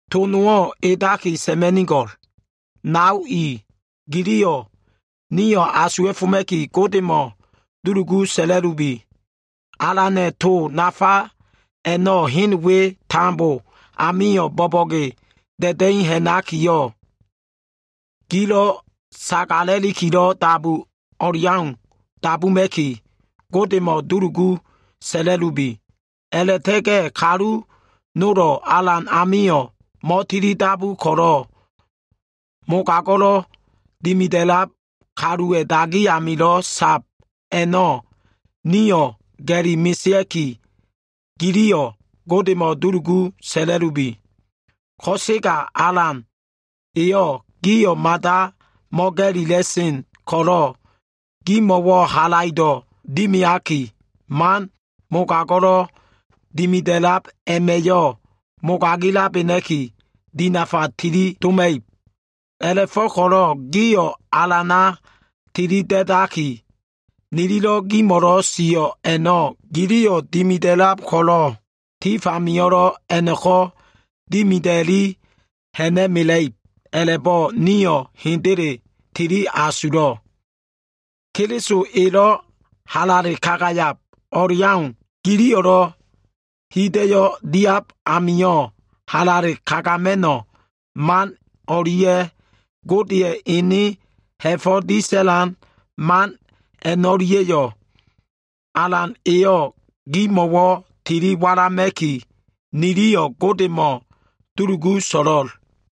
To nowo꞉ edaki sa꞉ma꞉nigo꞉l. Nao i giliyo꞉ nio꞉ asuwa꞉foma꞉ki, Godemo꞉ dulugu sa꞉la꞉lubi. Alana꞉ to nafa a꞉no꞉ hen we tambo amio꞉ bo꞉bo꞉ge da꞉da꞉i ha꞉nakiyo꞉, gilo꞉ sagala꞉likilo꞉ dabu o꞉leau dabuma꞉ki, Godemo꞉wo꞉ dulugu sa꞉la꞉lubi. A꞉la꞉ta꞉ga꞉ kalu nolo꞉ Alan amio꞉ mo꞉tilidabu ko꞉lo꞉ mogago꞉lo꞉ dimida꞉lab kaluwa꞉ dagi amilo꞉ a꞉lab a꞉no꞉ nio꞉ ga꞉li mesea꞉ki, giliyo꞉ Godemo꞉ dulugu sa꞉la꞉lubi. Ko꞉sega Alan e gio꞉ mada mo꞉ga꞉lila꞉sen ko꞉lo꞉, gimo꞉wo꞉ halaido꞉ dimiaki, man mogago꞉lelo꞉ dimida꞉sen Sa꞉da꞉na꞉ a꞉ma꞉yo꞉ mogagilabena꞉ki dinafa tilidoma꞉ib. A꞉la꞉fo꞉ko꞉lo꞉ gio꞉ Alana tilida꞉daki, nililo꞉ gimo꞉lo꞉ sio꞉ a꞉no꞉ giliyo꞉ dimida꞉lab ko꞉lo꞉, tifamio꞉lo꞉ a꞉no꞉ko꞉ dimida꞉li ha꞉na꞉mela꞉ib a꞉la꞉bo꞉ nio꞉ hendele tili asulo꞉. Keliso elo꞉ halale kagayab o꞉leau giliyo꞉lo꞉ hida꞉yo꞉ diab amio꞉ halale kagama꞉no꞉ man o꞉lia꞉ Godeya꞉ ene ha꞉fo꞉ disa꞉lan man a꞉no꞉lia꞉yo꞉, Alan eyo꞉ gimo꞉wo꞉ tili walama꞉ki, nio꞉ Godemo꞉ dulugu so꞉lo꞉l.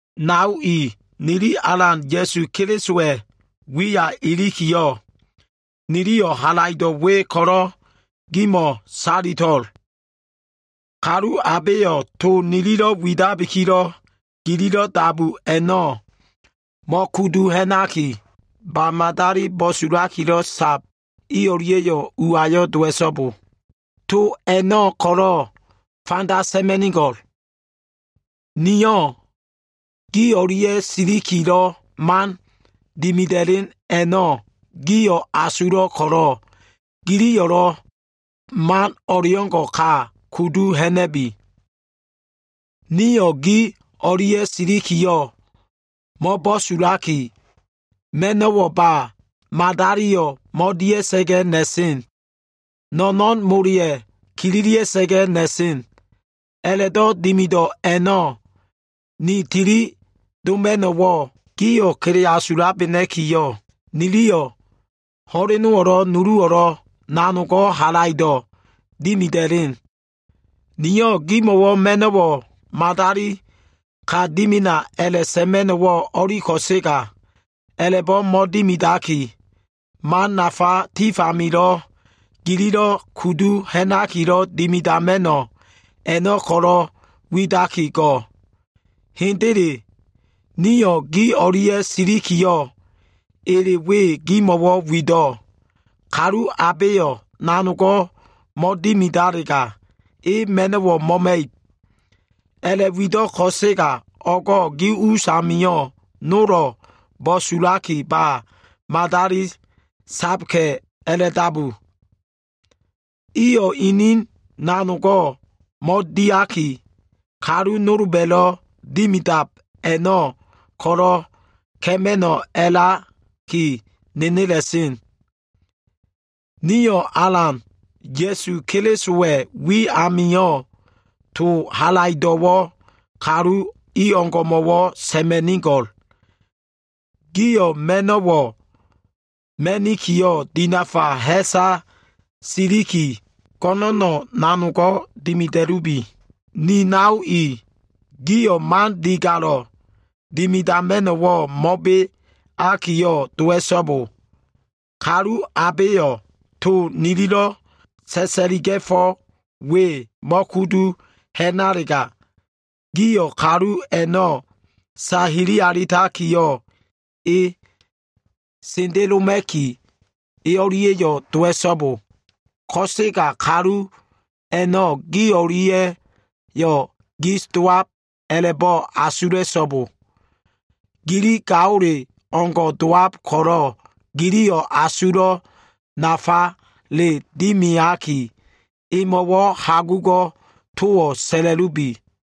Nao i, nili Alan Ya꞉su Kelisowa꞉ wiya ilikiyo꞉, niliyo꞉ halaido꞉ we ko꞉lo꞉ gimo꞉ salito꞉l. Kalu abeyo꞉ to nililo꞉ widabikilo꞉ gililo꞉ dabu a꞉no꞉ mo꞉kudu ha꞉naki, ba madali bo꞉sulakilo꞉ sab i o꞉lia꞉yo꞉ uayo꞉ dowa꞉so꞉bo. To a꞉no꞉ ko꞉lo꞉ fanda sa꞉ma꞉nigo꞉l. Nio꞉ gi o꞉lia꞉ silikilo꞉ man dimida꞉len a꞉no꞉ gio꞉ asulo꞉ ko꞉lo꞉, giliyo꞉lo꞉ man o꞉leo꞉ngo꞉ ka kudu ha꞉na꞉bi. Nio꞉ gi o꞉lia꞉ silikiyo꞉ mo꞉bo꞉sulaki, ma꞉no꞉wo꞉ ba madaliyo꞉ mo꞉dia꞉sa꞉ga꞉ na꞉sen. No꞉no꞉n moleya꞉ kililia꞉sa꞉ga꞉ na꞉sen. A꞉la꞉do꞉ dimido꞉ a꞉no꞉, ni tili doma꞉no꞉wo꞉ gio꞉ kele asulabena꞉kiyo꞉, niliyo꞉ ho꞉lenowo꞉lo꞉ nuluwo꞉lo꞉ nanogo꞉ halaido꞉ dimida꞉len. Nio꞉ gimo꞉wo꞉ ma꞉no꞉wo꞉ madali ka dimina a꞉la꞉sa꞉ma꞉no꞉wo꞉ o꞉li ko꞉sega, a꞉la꞉bo꞉ mo꞉dimidaki, man nafa tifamilo꞉ gililo꞉ kudu ha꞉nakilo꞉ dimidama꞉no꞉, a꞉no꞉ ko꞉lo꞉ widaki go꞉. Hendele, nio꞉ gi o꞉lia꞉ silikiyo꞉, ele we gimo꞉wo꞉ wido꞉. “Kalu abeyo꞉ nanogo꞉ mo꞉dimidalega, e ma꞉no꞉wo꞉ mo꞉ma꞉ib.” A꞉la꞉wido꞉ ko꞉sega, o꞉go꞉ gi us amio꞉ nolo꞉ bo꞉sulaki ba madali saka꞉ a꞉la꞉dabu. Iyo꞉ inin nanogo꞉ mo꞉diaki, kalu nolba꞉lo꞉ dimidab a꞉no꞉ ko꞉lo꞉ ka꞉ma꞉no꞉ a꞉laki nenela꞉sen. Nio꞉ Alan Ya꞉su Kelisowa꞉ wi amio꞉, to halaido꞉wo꞉ kalu i o꞉ngo꞉mo꞉wo꞉ sa꞉ma꞉nigo꞉l. Gio꞉ ma꞉no꞉wo꞉ ma꞉nikiyo꞉, dinafa ha꞉sa siliki go꞉no꞉no꞉ nanogo꞉ dimida꞉lubi. Ni nao i, gio꞉ man digalo꞉ dimidama꞉no꞉wo꞉ mo꞉beakiyo꞉ dowa꞉so꞉bo. Kalu abeyo꞉ to nililo꞉ sa꞉sa꞉liga꞉fo꞉ we mo꞉kudu ha꞉nalega, gio꞉ kalu a꞉no꞉ sahili alitakiyo꞉ e sendeloma꞉ki, e o꞉lia꞉yo꞉ dowa꞉so꞉bo. Ko꞉sega kalu a꞉no꞉ gi o꞉lia꞉yo꞉ gis dowab a꞉la꞉bo꞉ asula꞉so꞉bo. Gili gaole o꞉ngo꞉ dowab ko꞉lo꞉, giliyo꞉ asulo꞉ nafale dimiaki, emo꞉wo꞉ hagugo꞉ towo꞉ sa꞉la꞉lubi.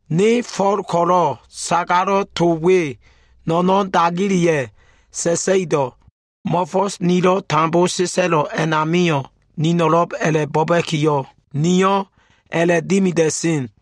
Ne Fo꞉l ko꞉lo꞉, sagalo꞉ to we no꞉no꞉n dagileya꞉ sa꞉sa꞉ido꞉. Mo꞉fo꞉s nilo꞉ tambo sa꞉sa꞉lo꞉ a꞉namio꞉, nino꞉lo꞉b a꞉la꞉bo꞉ba꞉kiyo꞉, niyo꞉ a꞉la꞉dimida꞉sen.